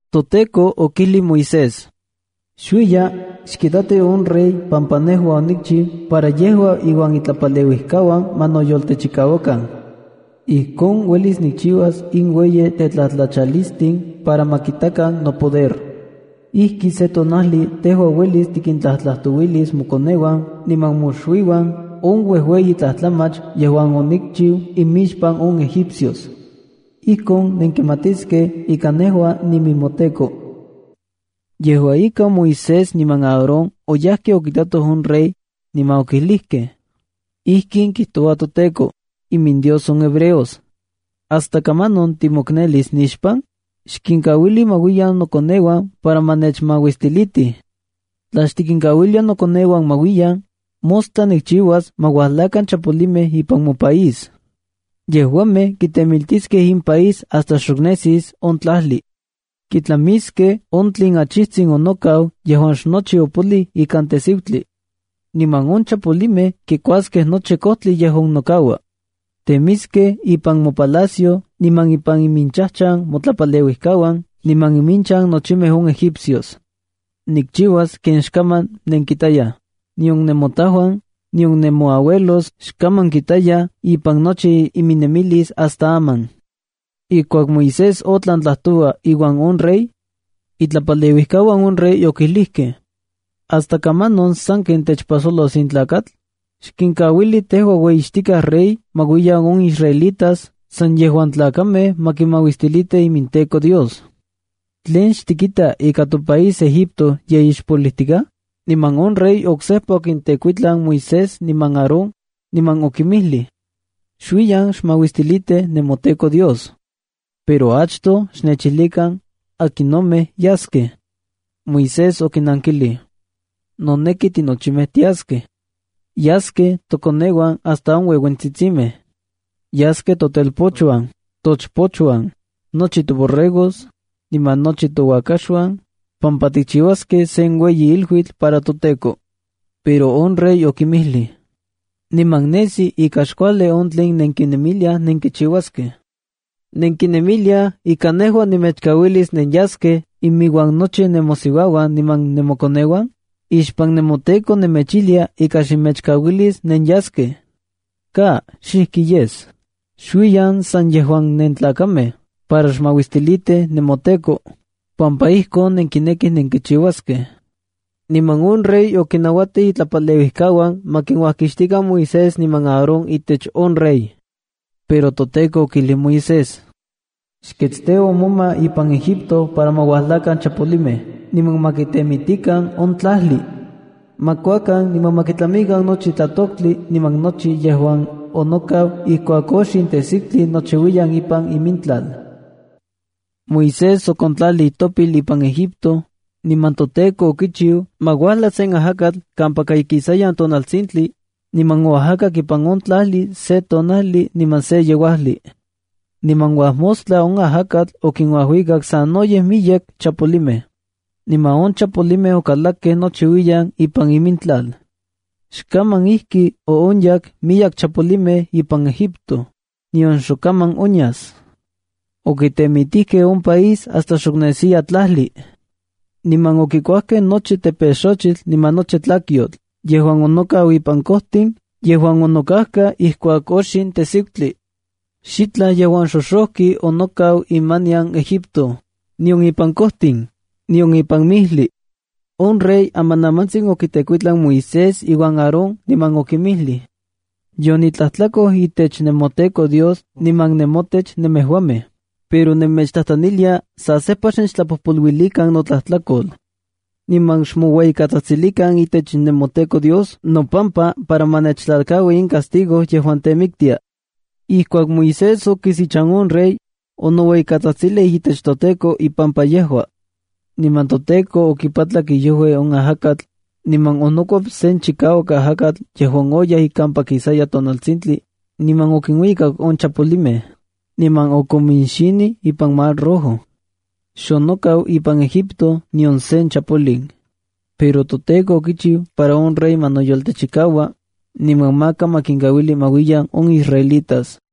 ToTEKO okijlij Moisés: —Xuiya, xkitati on rey pampa nejua onikchiu para yejua iuan itlapaleuijkauan ma noyoltechikauakan. Ijkon uelis nikchiuas in uejueyi tetlatlachalistin para ma kitakan nopoder. Ijki se tonajli tejua uelis tikintlajtlajtouilis mokoneuan niman moxuiuan on uejueyi tlajtlamach yejuan onikchiu imixpan on egipcios. Ijkon nenkimatiskej ika nejua ninemoTEKO. Yejua ika, Moisés niman Aarón oyajkej okitatoj on rey, niman okijlijkej: —Ijkin kijtoua toTEKO, iminDios on hebreos: “¿Hasta kamanon timoknelis nixpan? Xkinkauili ma uiyan nokoneuan para ma nechmauistilitij. Tla xtikinkauilia nokoneuan ma uiyan, mostla nikchiuas ma uajlakan chapolimej ipan mopaís. Yejuamej kitemiltiskej in país hasta xok nesis on tlajli. Kitlamiskej on tlen achijtsin onokau yejuan xnochi opoliu ikan tejsiutli. Niman on chapolimej kikuaskej nochi kojtli yejuan nokaua. Temiskej ipan mopalacio niman ipan iminchajchan motlapaleuijkauan niman iminchan nochimej on egipcios. Nikchiuas ken xkaman nenkitayaj, nion nemotajuan, nion nemoauelos xkaman kitayaj ipan nochi iminnemilis hasta aman.” Ijkuak Moisés otlan tlajtoua iuan on rey. Itlapaleuijkauan on rey okijlijkej: —¿Hasta kamanon sanken techpajsolos in tlakatl? Xkinkauili tejua ueyixtikaj rey ma uiyan on israelitas san yejuan tlakamej ma kimauistilitij iminTEKO Dios. ¿Tlen xtikita ika topaís Egipto ye ixpolijtikaj? Niman on rey oksejpa okintekuitlan Moisés niman Aarón, niman okinmijlij: —Xuiyan xmauistilitij nemoTEKO Dios. Pero achtoj xnechijlikan, akinomej yaskej. Moisés okinankilij: —Noneki tinochimej tiaskej. Yaskej tokoneuan hasta on ueuentsitsimej. Yaskej totelpochuan, tochpochuan, nochi toborregos, niman nochi touakaxuan, pampa tikchiuaskej sen ueyi iluitl para toTEKO. Pero on rey okinmijlij: —Niman nesi ika xkuajli on tlen nenkinemiliaj nenkichiuaskej. ¿Nenkinemiliaj ika nejua nemechkauilis nenyaskej iminuan nochi nemosiuauan niman nemokoneuan? Ixpan nemoTEKO nemechijlia ika xnemechkauilis nenyaskej. ¡Ka! ¡Xijki yes! Xuiyan san yejuan nentlakamej para xmauistilitij nemoTEKO, pampa ijkon nenkinekij nenkichiuaskej. Niman on rey okinnauatij itlapaleuijkauan ma kuajkixtikan Moisés niman Aarón itech on rey. Pero toTEKO okijlij Moisés: —Xketsteua moma ipan Egipto para ma uajlakan chapolimej niman ma kitemitikan on tlajli. Ma kuakan niman ma kitlamikan nochi tlatoktli niman nochi yejuan onokau ijkuak oxin tejsiutli nochiuiyan ipan imintlal. Moisés okontlalij itopil ipan Egipto, niman toTEKO okichiu ma uajla sen ajakatl kampaka ikisayan tonaltsintli, niman oajakak ipan on tlajli se tonajli niman se yeuajli. Niman uajmostla on ajakatl okinuajuikak sanoyej miyek chapolimej. Niman on chapolimej okalakkej nochiuiyan ipan imintlal. Xkaman ijki oonyak miyek chapolimej ipan Egipto, nion xok kaman onyas. Okitemitijkej on país hasta xok nesiya tlajli. Niman okikuajkej nochi tepexojtli niman nochi tlakyotl yejuan onokau ipan kojtin yejuan onokajka ijkuak oxin tejsiutli. Xitlaj yejuan xoxojki onokau imanian Egipto, nion ipan kojtin, nion ipan mijlij. On rey amanamantsin okitekuitlan Moisés iuan Aarón, niman okinmijlij: —Yonitlajtlakoj itech nemoTEKO Dios niman nemotech nemejuamej, pero nemechtlajtlanilia sa sejpa xnechtlapojpoluilikan notlajtlakol. Niman xmoueyitsajtsilikan itech nemoTEKO Dios nopampa para ma nechtlalkaui in castigo yejuan temiktia. Ijkuak Moisés okis ichan on rey, onoueyikatsajtsilij itech toTEKO ipampa yejua. Niman toTEKO okipatlak iojui on ajakatl, niman onokuep sen chikauak ajakatl yejuan oyaj kampaka ikisayan tonaltsintli, niman okinuikak on chapolimej, niman okominxinij ipan Mar Rojo. Xonokau ipan Egipto nion sen chapolin. Pero toTEKO okichiu para on rey ma noyoltechikau, niman maka ma kinkauili ma uiyan on israelitas.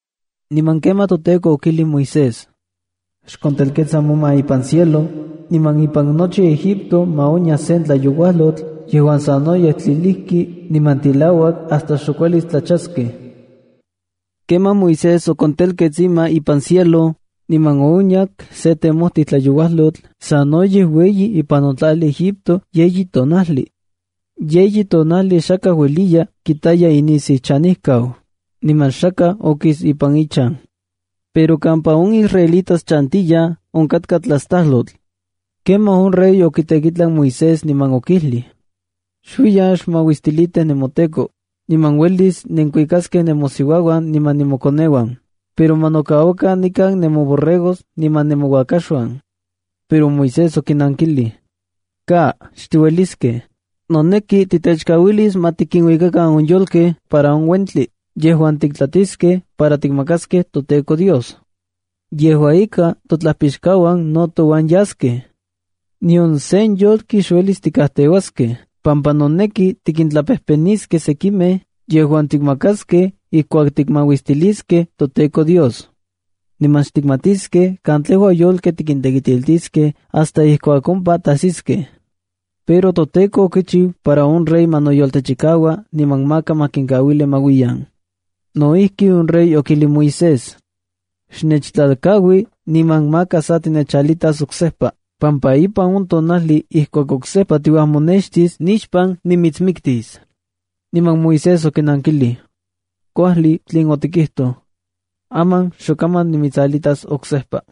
Niman kemaj toTEKO okijlij Moisés: —Xkontelketsa moma ipan cielo, niman ipan nochi Egipto ma onya sen tlayouajlotl yejuan sanoyej tlilijki niman tilauak hasta xok uelis tlachaskej. Kemaj Moisés okontelkets ima ipan cielo, niman oonyak sen temojtij tlayouajlotl sanoyej ueyi ipan on tlajli Egipto yeyi tonajli. Yeyi tonajli xakaj ueliya kitaya inisiuchanejkau, niman xakaj okis ipan ichan. Pero kampa on israelitas chantiyaj, onkatka tlastajlotl. Kemaj on rey okitekuitlan Moisés, niman okijlij: —Xuiyan xmauistilitij nemoTEKO, niman uelis nenkinuikaskej nemosiuauan niman nemokoneuan, pero ma nokauakan nikan nemoborregos iminuan nemouakaxuan. Pero Moisés okinankilij: —¡Ka! ¡Xtiueliskej! Noneki titechkauilis ma tikinuikakan on yolkej para on uentli yejuan tiktlatiskej para tikmakaskej toTEKO Dios. Yejua ika, totlajpixkauan no touan yaskej. Nion sen yolki xuelis tikajteuaskej pampa noneki tikintlapejpeniskej sekimej yejuan tiktemakaskej ijkuak tikmauistiliskej toTEKO Dios. Niman xtikmatiskej katlejua yolkej tikintekitiltiskej hasta ijkuak ompa tajsiskej. Pero toTEKO okichiu para on rey ma noyoltechikau niman maka ma kinkauilij ma uiyan. No ijki, on rey okijlij Moisés: —Xnechtlalkaui niman maka sa tinechalitas oksejpa pampa ipan on tonajli ijkuak oksejpa tiuajmonextis nixpan nimitsmiktis. Niman Moisés okinankilij: —Kuajli on tlen otikijtoj. Aman xok kaman nimitsalitas oksejpa.